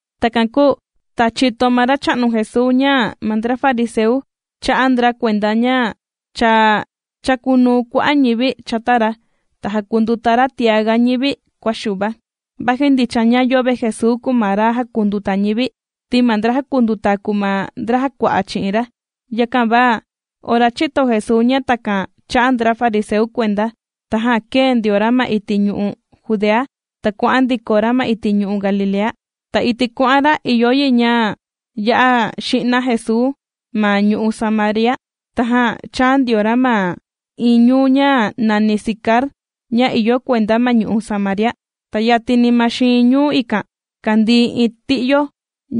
Takan kūu ta chīto ma Racha'nu Jesuu ña ma ndra fariseu chā'a ndra kuenda ña cha chàkunuu kua'a' ñivi chata ra ta jàkunduta ra tiaga ñivi kua Xuva; vaji ndicha ña yöve Jesuu kùu ma ra jàkunduta ñivi, ti ma ndra jàkunduta kùu ma ndra jàkua'a chi'in ra. Yakan va ora chīto Jesuu ña takan chà'a ndra fariseu kuenda, tajan kēe ndio ra ma iti' ñu'u' Judea, ta kuà'an ndiko ra ma iti' ñu'u' Galilea. Ta iti' kuà'an ra ìyo yi ña ya'a ji'na Jesuu ma ñu'u' Samaria. Tajan chāa ndio ra ma iin ñuu ña nàni Sicar ña ìyo kuenda ma ñu'u' Samaria. Ta yatini ma xiin ñuu ikan kàndii iin ti'yo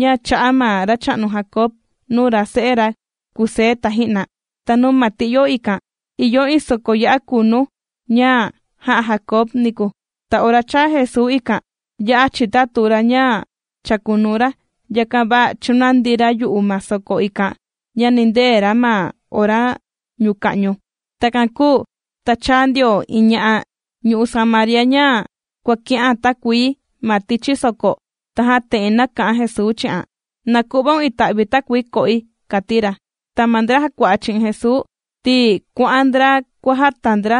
ña chā'a ma racha'nu Jacob nuu rase'e ra, Kusé taji'na. Ta nuu ma ti'yo ikan ìyo iin soko ya'a kunu ña jā'a Jacob niku. Ta ora chāa Jesuu ikan ya'a chitatu ra ña chākunuu ra, yakan va chūnandi ra yu'u ma soko ikan, ña nìndee ra ma ora ñuka'ñu. Takan kūu ta chāa ndio iin ña'a ñu'u' Samaria ña kuàki'an takuii ma tichi soko, tajan te'en nāka'an Jesuu chi'an: ―Na ku'vaun ita'vi takuii ko'i, yo'o ma'á ―kàti ra. Ta ma ndra jàkua'a chi'in Jesuu, ti kuà'an ndra kuàjata ndra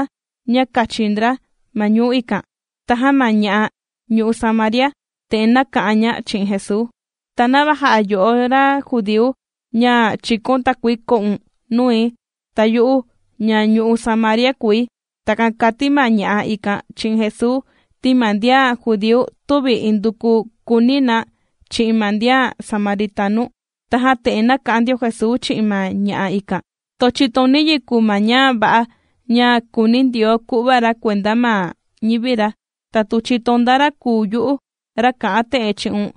ña kachi ndra ma ñuu ikan. Tajan ma ña'a ñu'u' Samaria, te'en nāka'an ña chi'in Jesuu: ―¿Ta nava jà'a yo'o ra judíu ña chìkaun takuii ko'un nui, ta yu'u ña ñu'u' Samaria kùi? ―Takan kàti ma ña'a ikan chi'in Jesuu ti ma ndian judíu tüvi induku kùuni na chi'in ma ndian samaritanu. Tajan te'en nāka'an ndio Jesuu chi'in ma ña'a ikan: ―Tu chìtoun niyi kùu ma ña va'a ña kùuni Ndioo ku'va ra kuenda ma ñivi ra, ta tu chìtoun nda ra kùu yu'u ra kā'an te'en chi'un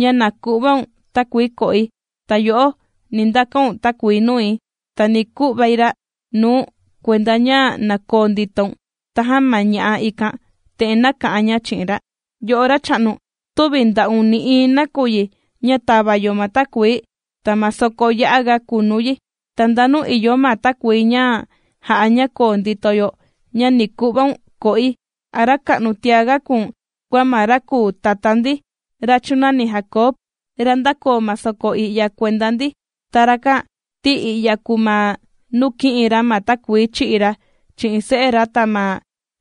“ña na ku'vaun takuii ko'i”, ta yo'o, ni ndakaun takuii nui, ta ni ku'vai ra' nuu̱n kuenda ña na koo nditoun. Tajan ma ña'a ikan te'en nāka'an ña chi'in ra: ―Yo'o racha'nu tüvi nda'un nï'iin nakuyi ña tàva yo ma takuii, ta ma soko ya'a ga kunu yi. ¿Ta ndanu ìyo ma takuii ña jà'a ña koo ndito yo ña ni ku'vaun ko'i? ¿A ra ka'nu tiaga kùu̱n kua ma ra kūu tatá ndi ra chūnani Jacob, ra ndākoo ma soko i'ya kuenda ndi? Ta rakan ti i'ya kūu ma nuu kī'in ra ma takuii chī'i ra chi'in se'e ra ta ma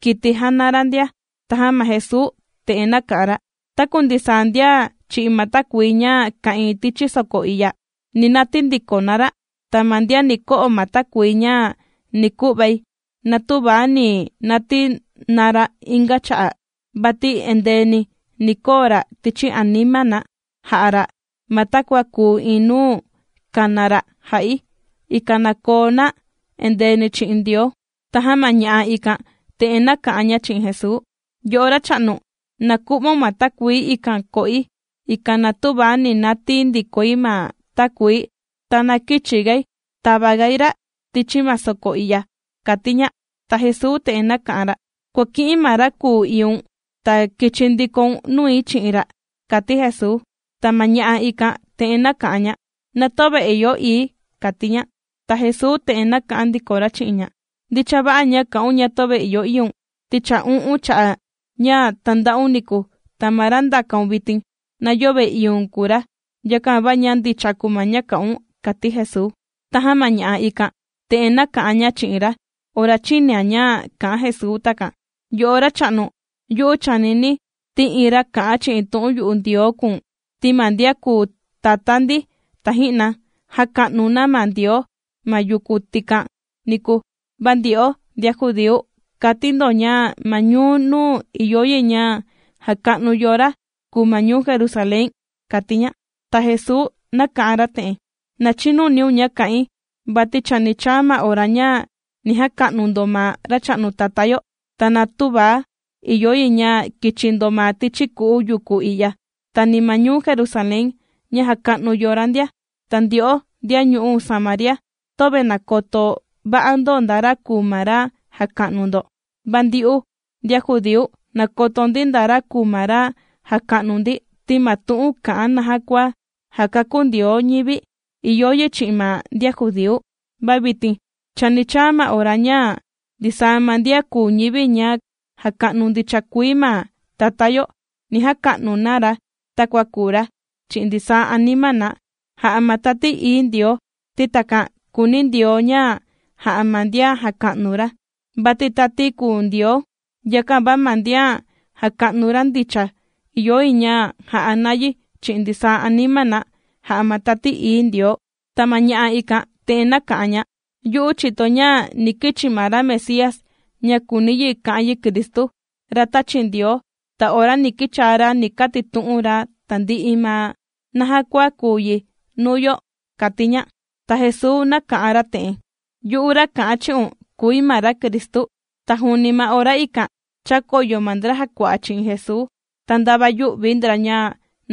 kiti jàna ra ndia. Tajan ma Jesuu te'en nāka'an ra: ―Taku ndisaa ndian chì'i ma takuii ña ka'ìin tichi soko i'ya, ni natii ndiko na ra'. Ta ma ndian ni ko'o ma takuii ña ni ku'vai, na tüva ni natii na ra' inga cha'a, vati endeeni ni koo ra' tichi anima na jà'a ra' ma takua kùu iin nuu kàna ra' jà'i, ikan na koo na endeeni chi'in Ndioo. Tajan ma ña'a ikan te'en nāka'an ña chi'in Jesuu: ―Yo'o racha'nu, na ku'vaun ma takuii ikan ko'i, ikan na tüva ni natii̱ ndikoi ma takuii, ta na kïchi gai tava gai ra' tichi ma soko i'ya ―kàti ña. Ta Jesuu te'en nāka'an ra: ―Kuàki'in ma ra kùu iiun, ta kichi ndikoun nui chi'in ra ―kàti Jesuu. Ta ma ña'a ikan te'en nāka'an ña: ―Na töve ìyo ii̱ ―kàti ña. Ta Jesuu te'en nāka'an ndiko ra chi'in ña: ―Ndicha va'a ña kà'un ña töve ìyo iiun, ti cha u'un cha'a' ña tānda'un niku, ta ma ra ndàkaun vitin na yöve iiun kùu ra. Yakan va ña ndicha kùu ma ña kà'un ―kàti Jesuu. Tajan ma ña'a ikan te'en nāka'an ña chi'in ra ora chīnian ña kà'an Jesuu takan: ―Yo'o racha'nu, yu'u chànini̱ ti iin ra kà'an chi'in tu'un yu'u Ndioo kùu̱n. Ti ma ndian kūu tatá ndi taji'na jāka'nu na ma Ndioo ma yuku tikan niku, va ndyo'o ndian judíu, kàti ndo ña ma ñuu nuu ìyo yi ña jaka'nu yo ra kùu ma ñuu Jerusalén ―kàti ña. Ta Jesuu nāka'an ra te'en: ―Na chinuniun ña kà'in, vati chani chaa ma ora ña ni jaka'nu ndo ma Racha'nu Tatá yo, ta na tüva ìyo yi ña kichi ndo ma tichi ku'u yuku i'ya, ta ni ma ñuu Jerusalén ña jàka'nu yo ra ndia. Ta ndyo'o ndian ñu'u' Samaria töve nàkoto va'a ndo nda ra kùu ma ra jàka'nu ndo, va ndyu'u ndian judíu, nàkoto ndi nda ra kùu ma ra jàka'nu ndi, ti ma tu'un kà'an naja kua jàkakú Ndioo ñivi, ìyo yi chi'in ma ndian judíu. Va vitin chani chaa ma ora, ña ndisaa ma ndian kùu ñivi ña jàka'nu ndicha kuii ma Tatá yo, ni jaka'nu na ra takua kùu ra, chi'in ndisaa anima na, jà'a ma Tati Ií Ndioo, ti takan kùuni Ndioo ña jà'a ma ndian jàka'nu ra. Vati tati kùu Ndioo, yakan va ma ndian jàka'nu ra ndicha, ìyo yi ña ja'a na yi chi'in ndisaa anima na, jà'a ma Tati Ií Ndioo. Ta ma ña'a ikan te'en nāka'an ña: ―Yu'u chìtoi ña ni kichi ma ra Mesías ña (kùuni yi ka'an yi Cristu,) ra tāchi Ndioo, ta ora ni kichaa ra ni katitu'un ra tandi'i ma naja kua kùu yi nuu yo ―kàti ña. Ta Jesuu nāka'an ra te'en: ―¡Yu'u ra kà'an chi'un kùi ma ra Cristu! Ta juuni ma ora ikan chākoyo ma ndra jàkua'a chi'in Jesuu, ta ndava yū'vi ndra ña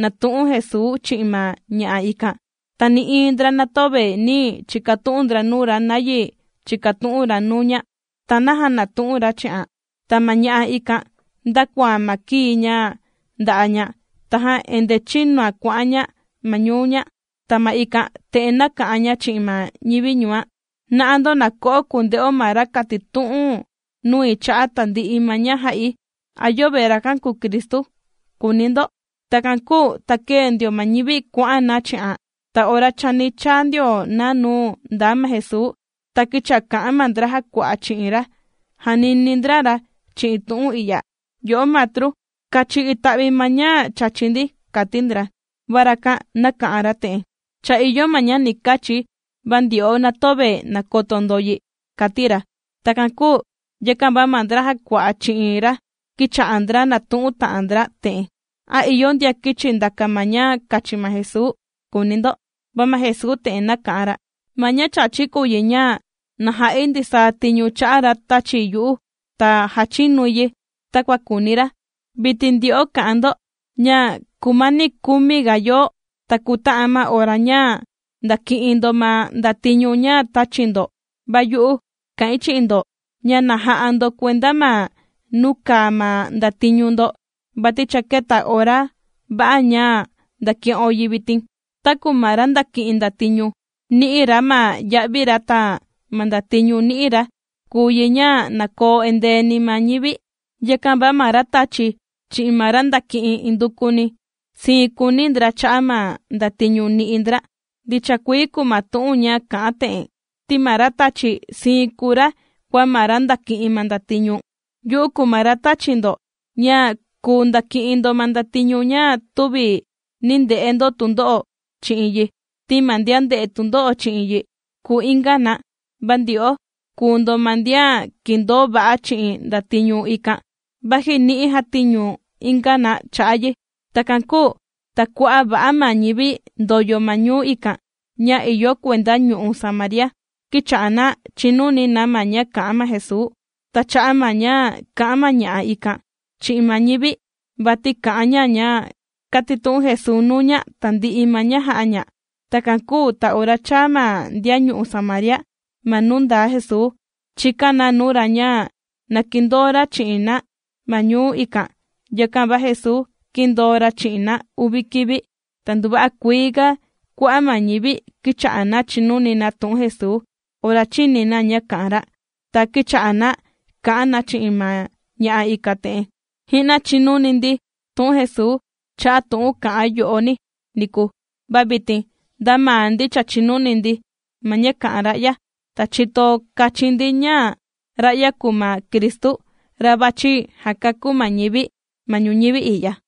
nàtu'un Jesuu chi'in ma ña'a ikan. Ta nï'iin ndra na töve nī chikatu'un ndra nuu ra, nayi chìkatu'un ra nuu ña, ta naja nàtu'un ra chi'an. Ta ma ña'a ikan ndākoan ma kii ña nda'a' ña, tajan endee chīnuan kuà'an ña ma ñuu ña, ta ma ikan te'en nāka'an ña chi'in ma ñivi ñuan: ―¡Na'a ndo na ko'o kunde'o ma ra kātitu'un nui cha'a' tandi'i ma ña jà'i! ¿A yöve rakan kùu Cristu?, kùuni ndo. Takan kūu ta kēe ndio ma ñivi kuà'an na chi'an ta ora chani chaa ndio na nuu ndaa ma Jesuu. Ta kīcha'a kà'an ma ndra jàkua'a chi'in ra, jànini ndra ra chi'in tu'un i'ya: ―Yo'o Matru, kachi ita'vi ma ña chàchi ndi ―kàti ndra. Va rakan nāka'an ra te'en: ―Cha ìyo ma ña ni kachi̱ va ndyo'o na töve nàkoto ndo yi ―kàti ra. Takan kūu, yakan va ma ndra jàkua'a chi'in ra kīcha'a ndra nàtu'un ta'an ndra te'en: ―¿A ìyo ndian kīchi ndàka ma ña kachi ma Jesuu?, kùuni ndo. Va ma Jesuu te'en nāka'an ra: ―Ma ña chàchi̱ kùu yi ña na ja'i ndisaa tiñu chà'a ra tāchi yu'u ta jàchinui yi takua kùuni ra. Vitin ndyo'o kà'an ndo ña kùmani kumi ga yoo ta kuta'an ma ora ña ndàki'in ndo ma ndatiñu ña tāchi ndo, va yu'u kà'in chi'in ndo ña na ja'a ndo kuenda ma nuu kàa ma ndatiñu ndo, vati cha kēta ora va'a ña ndàki'o yi vitin. Taku ma ra ndàki'in ndatiñu nì'i ra ma ya'vi ra ta ma ndatiñu nī'i ra, kùu yi ña na koo endeeni ma ñivi. Yakan va ma ra tàchi chi'in ma ra ndàki'in indukuni sii kùuni ndra cha'a' ma ndatiñu nì'i ndra. Ndicha kuii kùu ma tu'un ña kà'an te'en: “Ti ma ra tàchi, siin kùu ra kua ma ra ndàki'in ma ndatiñu.” Yu'u kùu ma ra tāchi̱ ndo ña kùu ndaki'in ndo ma ndatiñu, ña tüvi nī nde'e ndo tundo'o chi'in yi, ti ma ndian ndē'e tundo'o chi'in yi kùu inga na, va ndyo'o kùu ndo ma ndian kìndoo va'a chi'in ndatiñu ikan, vaji ni'i jātiñu inga na cha'a' yi. Takan kūu ta kua'a' va'a ma ñivi ndòyo ma ñuu ikan ña ìyo kuenda ñu'u' Samaria, kīcha'a na chìnuni na ma ña kà'an ma Jesuu, ta cha'a' ma ña kà'an ma ña'a ikan chi'in ma ñivi, vati kà'an ña ña kātitu'un Jesuu nuu ña tandi'i ma ña jā'a ña. Takan kūu ta ora chāa ma ndian ñu'u' Samaria ma nuu ndaa Jesuu, chīkan na nuu ra ña na kindoo ra chi'in na ma ñuu ikan. Yakan va Jesuu, kīndoo ra chi'in na uvi kivi. Ta nduva'a kuii ga kua'a' ma ñivi kīcha'a na chìnuni na tu'un Jesuu ora chīni na ña kà'an ra. Ta kīcha'a na kà'an na chi'in ma ña'a ikan te'en: ―Ji'na chìnuni ndi tu'un Jesuu cha'a' tu'un kà'an yo'oni niku, va vitin nda maa ndi cha chīni ndi ma ña kà'an ra'ya, ta chìto kachin ndi ña ra'ya kùu ma Cristu, ra vàchi jakakú ma ñivi ma ñuñivi i'ya.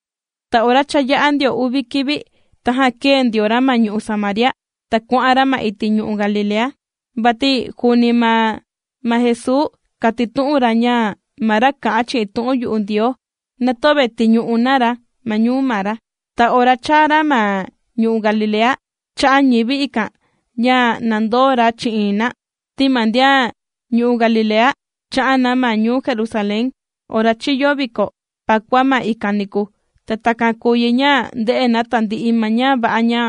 Ta ora cha yā'a ndio uvi kivi, tajan kēe ndio ra ma ñu'u' Samaria ta kuà'an ra ma iti' ñu'u' Galilea. Vati juuni maa ma Jesuu kātitu'un ra ña ma ra kà'an chi'in tu'un yu'u Ndioo, na töve tìñu'u na ra ma ñuu maa ra. Ta ora chāa ra ma ñu'u' Galilea, chā'a ñivi ikan ña na ndoo ra chi'in na, ti ma ndian ñu'u' Galilea chā'an na ma ñuu Jerusalén ora chìyo viko Pakua ma ikan niku, ta takan kūu yi ña ndē'e na tandi'i ma ña va'a ña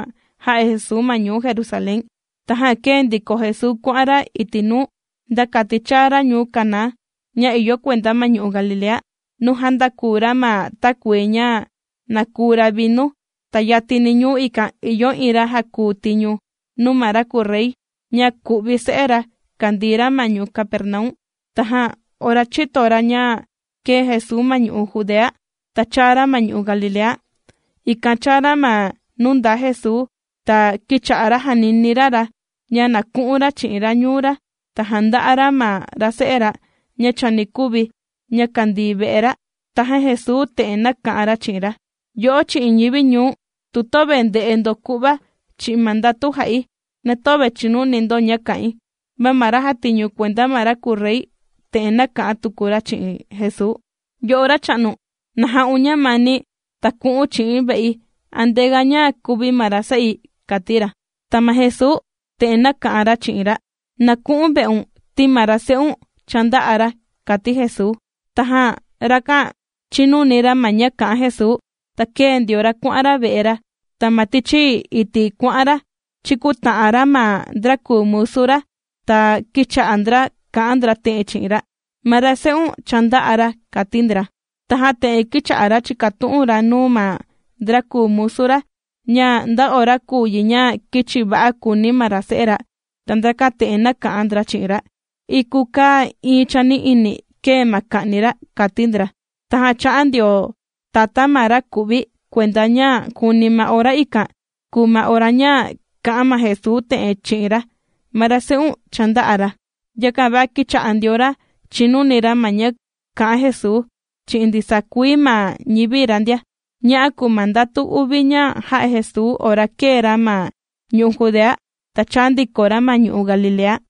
jā'a Jesuu ma ñuu Jerusalén. Tajan kēe ndiko Jesuu kuà'an ra iti' nuu, nda kati chāa ra ñuu Caná ña ìyo kuenda ma ñu'u' Galilea, nuu jāndaku ra ma takuii ña na kùu ra' vinu. Ta yatini ñuu ikan ìyo iin ra jàkuu tiñu nuu ma ra kùu rey, ña ku'vi se'e ra kàndii ra ma ñuu Capernaum. Tajan ora chīto ra ña kēe Jesuu ma ñu'u' Judea, ta chāa ra ma ñu'u' Galilea, ikan chāa ra ma nuu ndaa Jesuu, ta kīcha'a ra jànini ra ra ña na ku'un ra chi'in ra ñuu ra, ta janda'a ra ma ra se'e ra ña chani kuvi, ña kàndii ve'e ra. Tajan Jesuu te'en nāka'an ra chi'in ra: ―Yo'o chi'in ñivi ñuu̱n, tu töve ndè'e ndo ku'va chi'in ma ndatu jà'i, na töve chìnuni ndo ña kà'in. Va ma ra jàtiñu kuenda ma ra kùu rey te'en nāka'an tuku ra chi'in Jesuu: ―Yo'o racha'nu na ja'un ñamani ta ku'u̱n chi'i̱n ve'i, antea ña kuvi ma ra se'i ―kàti ra. Ta ma Jesuu te'en nāka'an ra chi'in ra: ―Na ku'u̱n ve'un, ti ma ra se'un cha ndā'a ra ―kàti Jesuu. Tajan rakan chīnuni ra ma ña kā'an Jesuu, ta kēe ndio ra kuà'an ra ve'e ra. Ta ma tichi iti' kuà'an ra chīkuta'an ra ma ndra kùu musu ra, ta kīcha'a ndra kà'an ndra te'en chi'in ra: ―Ma ra se'un cha ndā'a ra ―kàti ndra. Tajan te'en kīcha'a ra chìkatu'un ra nuu ma ndra kùu musu ra, ña nda ora kùu yi ña kīchi va'a kùuni ma ra se'e ra. Ta ndrakan te'en nāka'an ndra chi'in ra: ―Iku kaa iin chani'ini kēe ma kà'ni ra ―kàti ndra. Tajan chā'a ndio tatá ma ra ku'vi kuenda ña juuni ma ora ikan, kùu ma ora ña kā'an ma Jesuu te'en chi'in ra: “Ma ra se'un cha ndā'a ra.” Yakan va kīcha'a ndio ra chìnuni ra ma ña kà'an Jesuu chi'in ndisaa kuii ma ñivi ra ndia. Ña'a kùu ma ndatu uvi ña jā'a Jesuu ora kēe ra ma ñu'u' Judea ta chāa ndiko ra ma ñu'u' Galilea.